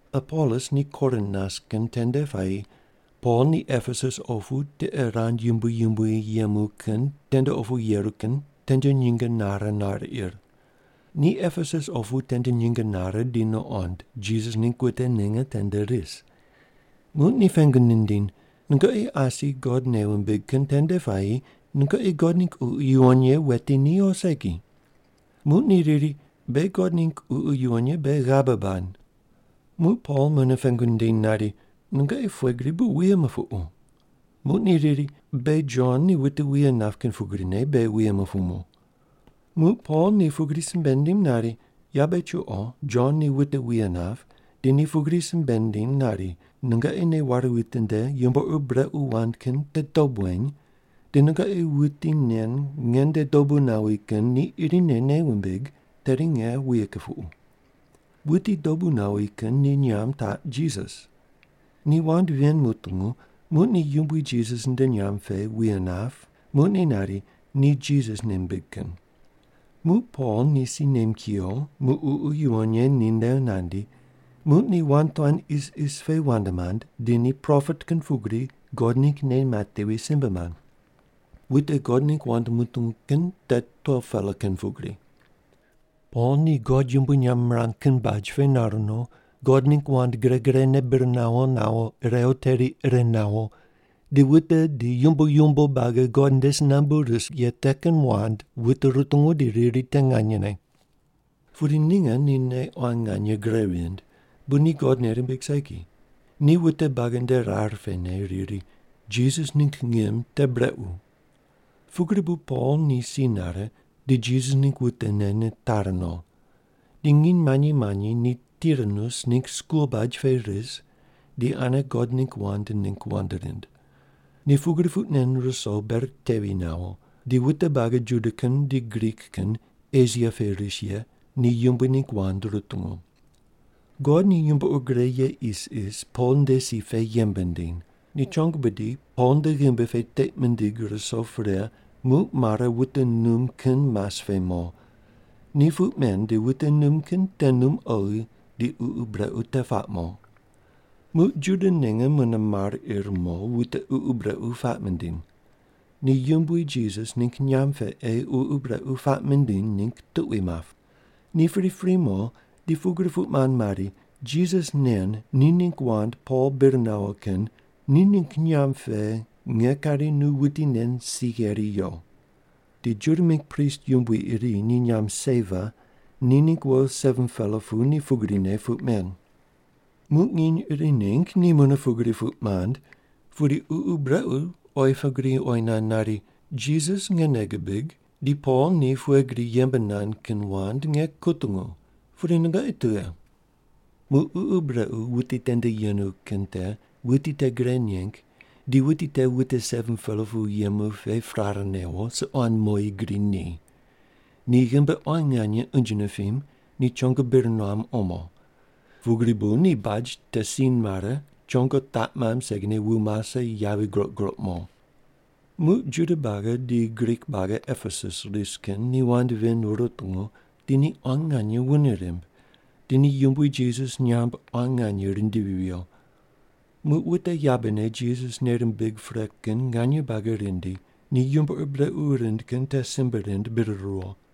Apolos ni Korin nas kin tende puayi Pol ni Epesus opu tiqe rand yumbui yumbui yemu kin tende opu yeru kin tende nyinge nare nar ir. Ni Epesus opu tende nyinge nare di nuqond, Jisas ningg wute ninge tende ris. Muq ni pengu nindiny, “Nungoqi asi God nei wumbig kin tende puayi nungoqi God ningg Ququ Yuwon Ye weti ni o segi?” Muq ni riri, “Beghi God ningg Ququ Yuwon Ye beghi ghabe bad.” Muq Pol mune pengu nindiny nari, “Nungoqi pughe gri bu wuye mupuqu?” Muq ni riri, “Beghi Jon ni wute wuye nap kin pugrine beghi wuye mupumu.” Muq Pol ni pugri simbe nindiny nari, “Yabe chuqo Jon ni wute wuye nap di ni pugri simbe nindiny nari, ‘Nungoqi nei ware witinde yumbo ur brequ wand kin te dob weny, di nungoqi wuti nen nge nde dobu nawi kin ni irine nei wumbig, tedi nge wuye kupuqu.’ Wuti dobu nawi kin ni nyamb taq Jisas.” Ni wand ven mutungu, muq ni Yumbui Jisas nde nyamb pe wuye nap, muq ni nari, “Ni Jisas nei mimbig kin.” Muq Pol ni si nem kuyo, muq Ququ Yuwon Ye ninde nandi, muq ni wand tuan isis pe wand mand, di ni propet kin pugri God ningg nei matevi simbe mand. Wute God ningg wand mutungu kin te 12-pela kin pugri. Pol ni God yumbui nyamb mirang kin baj pe nar no, God ningg wand gre grene bir nawo nawo irew teri ire nawo, di wute di yumbo yumbo buagi God nde si nambu ris ye te kin wand wute rutungu di riri te nganyene. Pudi ninge ni nei quan nganye gre vind, bu ni God nei rimbig segi. Ni wute buagi nde rar pene riri, “Jisas ningg ngim te brequ.” Pugri bu Pol ni si nare, di Jisas ningg wutene nitari no. Di nginy manyi manyi ni Tiranus ningg skul baj pe ris di ane God ningg wand ningg wand rind. Ni pugri puq nen ruso ber tevi nawo, di wute buagi Juda kin di Grik kin Esia pe ris ye ni Yumbui ningg wand rutungu. God ni yumbo ur gre ye isis Pol nde si pe yembe nindiny. Ni chongo bidi Pol nde ghimbi pe teiq mindig ruso pre muq mare wute num kin mas pe mo. Ni puq men di wute num kin te num oghi di ququ brequ te puaq mo. Muq Juda ninge mune mar ir mo wute ququ brequ puaq mindiny. Ni Yumbui Jisas ningg nyamb pe ei ququ brequ puaq mindiny ningg tuqui map. Ni pripri mo di pugri puq mand mari, “Jisas nen ni ningg wand Pol bir nawo kin ni ningg nyamb pe nge kari nu wuti nen si gheri yo.” Di Juda mingg prist yumbui iri ni nyamb Seva, ni ningg wo 7-pela pu ni pugrine puq men. Muq nginy iri ningg ni mune pugri puq mand, pudi ququ brequ te oyi pugri oyi nand nari, “Jisas nge nei gibig, di Pol ni pughe gri yembe nand kin wand nge kutungu. Pudi nungoqi tughe?” Muq ququ brequ wuti tende yenu kin te wuti te gre neng di wuti te wute 7-pela pu yemu pe prare newo, suquan moyi gri ni. Ni ghimbi quan nganye unje nipim, ni chongo bir nuam omo. Pugri bu ni baj te si mare, chongo taq mamb segine wu mase yavi groq groq mo. Muq Juda buagi di Grik buagi Epesus ris kin ni wand ven rutungu di ni quan nganye wune rimb, di ni Yumbui Jisas nyamb quan nganye rindivi viyo. Muq wute yabene Jisas nei rimbig pre kin nganye buagi rindi ni yumbo ur brequ rind kin te simbe rind bir ruwo.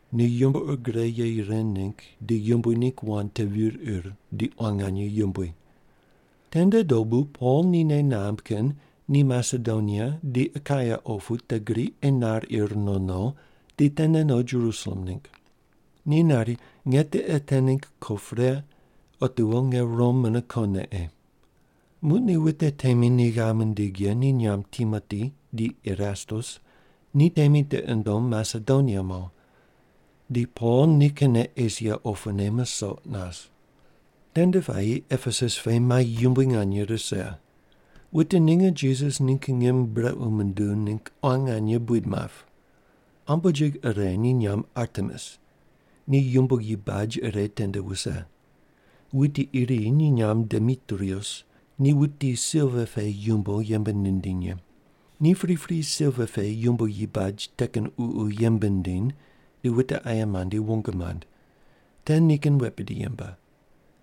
Ni yumbo ur gre ye ren ningg di Yumbui ningg wand te vir ir di quan nganye yumbui. Tende dobu Pol ni nei namb kin ni Masedonia di Akaia opu te gri ei nar ir no no di tene no Jerusalem ningg. Ni nari, “Nge tiqe te ningg ko pre, otiwo nge Rom mune kone ei.” Muq ni wute temi ni ghav mindig ye ni nyamb Timoti di Erastus ni temi tiqi nundom Masedonia mo. Di Pol nikinne Esia opune musoq nas. Tende puayi Epesus pe mai yumbui nganye rise. Wute ninge Jisas ningg ngim brequ munduw ningg quan nganye buid map. Ambojig ire ni nyamb Artemis. Ni yumboyi baj ire tende wuse. Wuti iri ni nyamb Demitrius, ni wuti silva pe yumbo yembe nindiny ye. Ni pripri silva pe yumboyi baj te kin ququ yembe nindiny di wute aye mandi wong mand. Te nikin wet bidi yembe.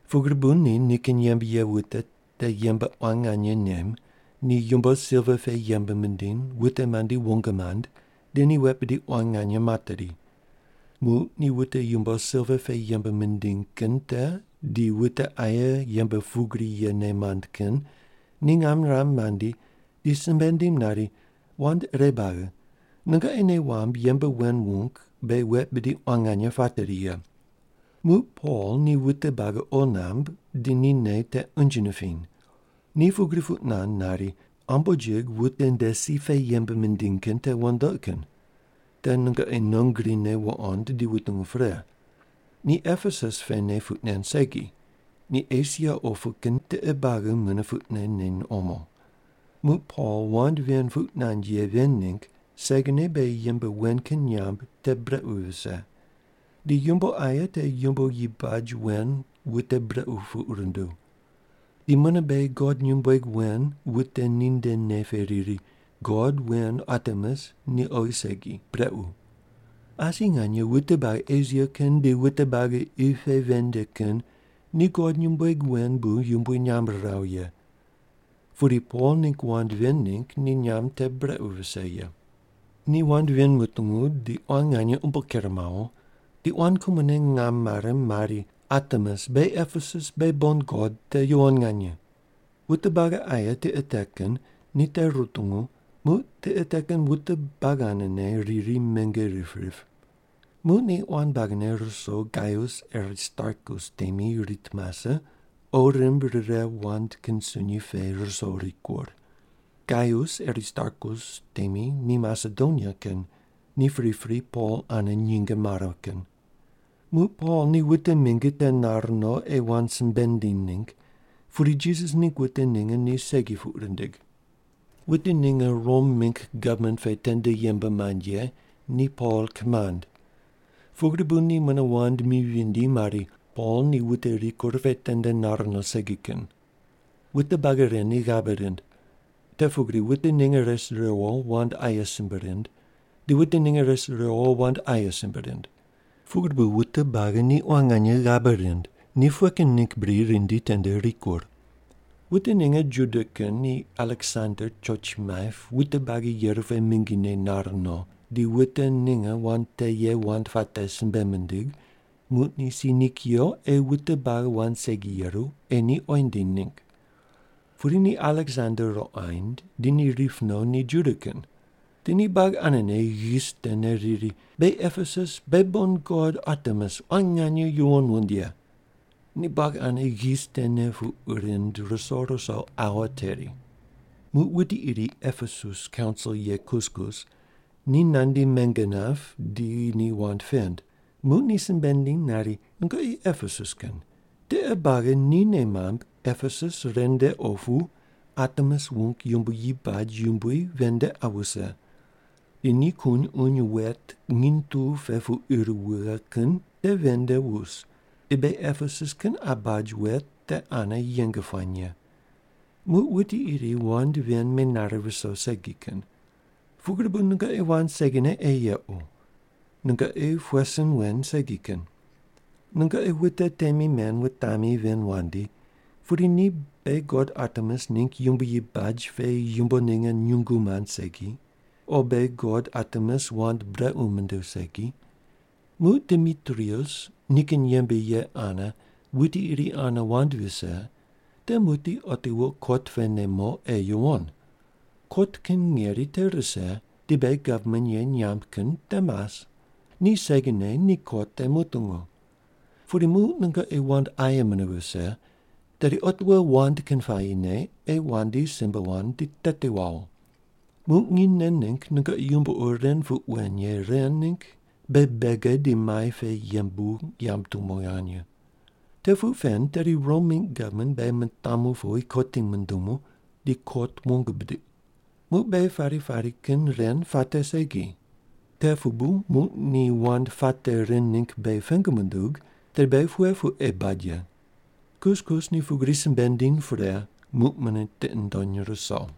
Pugri bu ni nikin yembe ye wute te yembe quan nganye nem, ni yumbo silva pe yembe mindiny wute mandi wong mand di ni wet bidi quan nganye materi. Muq ni wute yumbo silva pe yembe mindiny kin te di wute aye yembe pugri yene mand kin ni ngam niram mandi, di simbe nindim nari, “Wand ire buagi, nungoqi nei wamb yembe wen wung beghi wet bidi quan nganye pateri ye. Muq Pol ni wute buagi qo namb, di ni nei te unje nipiny. Ni pugri puq nand nari, ‘Ambojig wute nde si pe yembe mindiny kin te wandoqi kin.’ Te nungoqi non grine wuqond di wutungu pre. Ni Epesus pene puq nen segi, ni Esia opu kin tiqe buagi mune puqne neny omo. Muq Pol wand ven puq nand ye ven ningg segine beghi yembe wen kin nyamb te brequ vise. Di yumbo aye te yumboyi baj wen wute brequ puq runduw. Di mune beghi god nyumbueg wen wute ninde nei pe riri, ‘God wen Artemis ni oghi segi, brequ.’ Asi nganye wute buagi Esia kin di wute buagi qi pe ven nde kin ni god nyumbueg wen bu yumbui nyamb riraw ye. Pudi Pol ningg wand ven ningg ni nyamb te brequ vise ye.” Ni wand ven mutungu, di quan nganye umbo ker mawo, di quan kumone ngam mare mari, “Artemis, beghi Epesus beghi bon god te yuwon nganye!” Wute buagi aye tiqe te kin ni te rutungu muq tiqe te kin wute buagi anene riri menge rip rip. Muq ni quan buagine ruso Gaius Aristarkus temi rit mase, qo rimb rire wand kin sunyi pe ruso rikur. Gaius Aristarkus temi ni Masedonia kin, ni pripri Pol ane nyinge mare kin. Muq Pol ni wute mingi te nar no ei wand simbe nindiny ningg, pudi Jisas ningg wute ninge ni segi puq rindig. Wute ninge Rom mingg gavman pe tende yembe mand ye ni Pol kimand. Pugri bu ni mune wand mi vindi mari, “Pol ni wute rikur pe tende nar no segi kin.” Wute buagi ren ni ghabe rind. Te pugri wute ninge res riwo wand aye simbe rind, di wute ninge res riwo wand aye simbe rind. Pugri bu wute buagi ni quan nganye ghabe rind, ni pughe kin ningg bri rindi tende rikur. Wute ninge Juda kin ni Aleksander choch maip wute buagi yeru pe mingine nar no, di wute ninge wand te ye wand puate simbe mindig, muq ni si ni kuyo ei wute buagi wand segi yeru ei ni oyi nindiny ningg. Pudi ni Aleksander ruqoind, di ni rip no ni Juda kin. Di ni buagi anene ghis tene riri, “Beghi Epesus beghi bon god Artemis quan nganye yuwon wund ye.” Ni buagi ane ghis tene puq rind ruso ruso aua teri. Muq wuti iri Epesus kaunsil ye kuskus ni nandi menge nap di ni wand pend, muq ni simbe nindiny nari, “Nungoqi Epesus kin, tiqe buagi ni nei mamb Epesus ren nde opu Artemis wung yumboyi baj yumbui ven nde qa wuse. Di ni kun uny wet nginy tu pe pu ir wughe kin te ven nde wus, di beghi Epesus kin qa baj wet te ane yeng puany ye. Muq wuti iri wand ven menare viso segi kin. Pugri bu nungoqi wand segine ei yequ. Nungoqi pughe sin wen segi kin. Nungoqi wute temi men wutami ven wandi, pudi ni beghi god Artemis ningg yumboyi baj pe yumbo ninge nyungu mand segi, o beghi god Artemis wand brequ munduw segi. Muq Demitrius nikin yembe ye ane wuti iri ane wand vise, te muqdi otiwo kot pene mo ei yuwon. Kot kin ngeri te rise di beghi gavman ye nyamb kin te mas. Ni segine ni kot te mutungu. Pudi muq nungoqi wand aye mune vise tedi otiwo wand kin puayine ei wandi simbe wand di teti wawo. “Muq nginy nen ningg nungoqi yumbo ur ren puq wen ye ren ningg beghi bege di mai pe yembu yamb tumo nganye. Te puq pen, tedi Rom mingg gavman beghi mitamu powi kotim mundumu di kot wong bidiq. Muq beghi pari pari kin ren puate segi. Te pu bu muq ni wand puate ren ningg beghi pengu mundug, tedi beghi pughe puq ei bad ye?” Kuskus ni pugri simbe nindiny pre, muq mune tiqi nundony ruso.